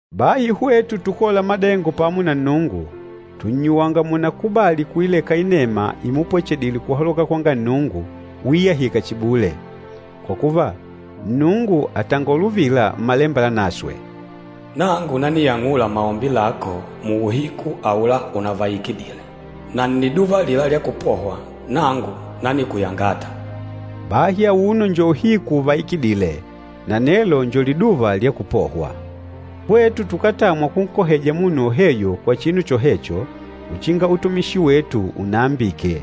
Bahi hwetu tukôla madengo pamo na Nnungu, tùnnyuwanga múnakubàlì kuileka inema imupwechedile kuhaloka kwanga Nnungu uiyahika chihi bule. Kwa kuva, Nnungu àtangola uvila Mmalemba Lanaswe, “Nangu naniyang'ula maombi lako muuhiku aula unavaikidile. Na nniduva alila lya kupohwa, nangu nanikuyangata.” Bahi auno njo uhiku uvaikidîle, na nelo njo liduva lya kupohwa! Hwetu tukátamwa kunkoheja munu woheyo kwa chinu chohecho uchinga utumishi wetu unaambike.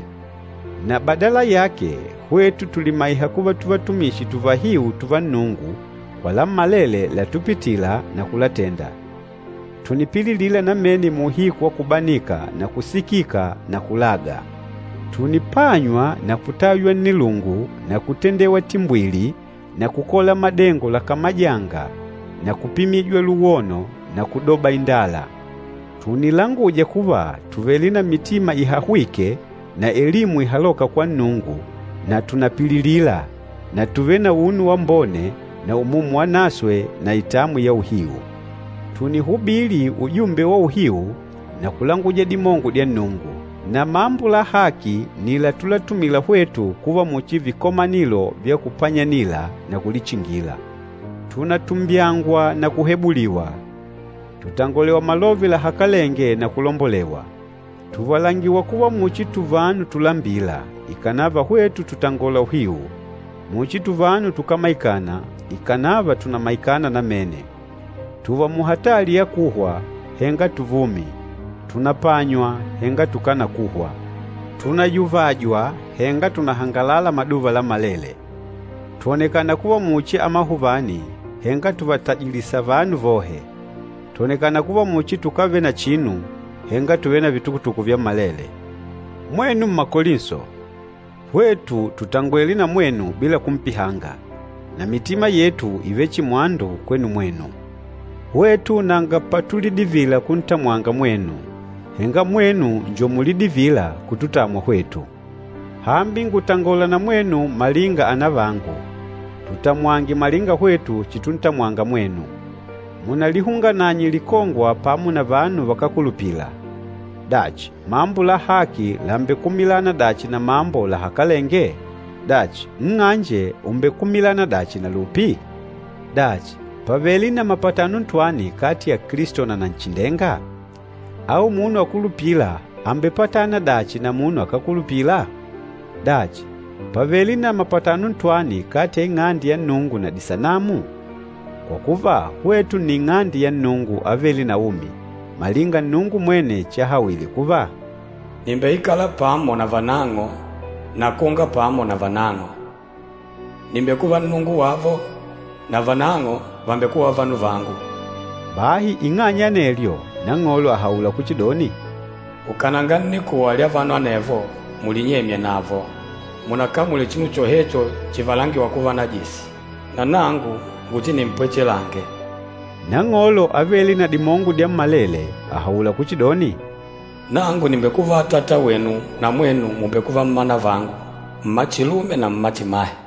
Na badala yake, hwetu tùlimaiha kuva tuvatumishi tuvahiu tùvá Nnungu kwa lammalele látupitìlà na kulatenda. Tùnipililila namene muuhiku wa kubanika na kusikika na kulaga. Tùnipanywa na kutaywa nnilungu na kutendewa timbwili na kukola madengo lakamajânga na kupimijwa luwono na kudoba indala. Tùnilanguja kuva tùvele na mitima ihahwîke na elimu ihalôka kwa Nnungu na tùnapililila, na tùvele na unu wambone na Umumu Wanaswe na itamwi ya uhiu. Tùnihubili ujumbe wa uhiu na kulanguja dimongo dya Nnungu. Na mambo la haki nni latulatumila hwetu kuva muchi vikomanilo vya kupanyanila na kulichingila. Tùnatumbyangwa na kuhebuliwa, tùtangolewa malove lahakalenge na kulombolewa. Tùvalangiwa kuva muchi vanu tulambîla, ikànava hwetu tùtangola uhiu, muchi tuvanu tukámaikana, ikànava tùnamaikana namene. Tùùva muhatali ya kuhwa, henga tuvumi, tùnapanywa henga tukánakuhwa. Tùnayuvajwa henga tùnahangalala maduva lammalele. Twònekana kuva muchi amahuvani, henga tùvatajilisa vanu vohe, twònekana kuva muchi tukávele na chinu, henga tùvele na vitukutuku vyammalele. Mwenu Mmakolinso, hwetu tùtangwele na mwenu bila kumpihanga, na mitima yetu ìvele chihi mwandu kwenu mwenu. Hwetu nanga patulidivila kuntamwanga mwenu, henga mwenu njo mulidivîla kututamwa hwetu. Hambi ngùtangola na mwenu malinga anavangu, tutamwange malinga hwetu chituntamwanga mwenu. Munalihungananye likongwa pamo na vanu vakákulupila. Dachi mambo la haki làmbekumilana dachi na mambo lahakalenge? Dachi, nng'anje ùmbekumilana dachi na lupi? Dachi, pàvele na mapatano ntwani kati ya Kilisto na Nanchindenga? Au munu akulupîla àmbepatana dachi na munu akákulupila? Dachi, pàvele na mapatano ntwani kati ya Ing'ande ya Nnungu na disanamu? Kwa kuva, hwetu nni Ing'ande ya Nnungu avêle na umi, malinga Nnungu mwene chahawile kuva, “Nìmbeikala pamo navanang'o, na kwonga pamo navanang'o. Nìmbekuva Nnungu wavo, navanang'o vàmbekuva vanu vangu.” Bahi ing'anya ya anelyo, Nang'olo àhaula kuchidoni, “Ukananga nnikuwa lya vanu anevo, mulinyemye navo. Munakamule chinu chohecho chivalangiwa kuva najisi, na nangu nguchinimpwechelange.” Nang'olo Avêle na Dimongo Dyammalele, àhaula kuchidoni, “Nangu nìmbekuva Atata wenu, na mwenu mùmbekuva mmanavangu, mmachilume na mmachimahe.”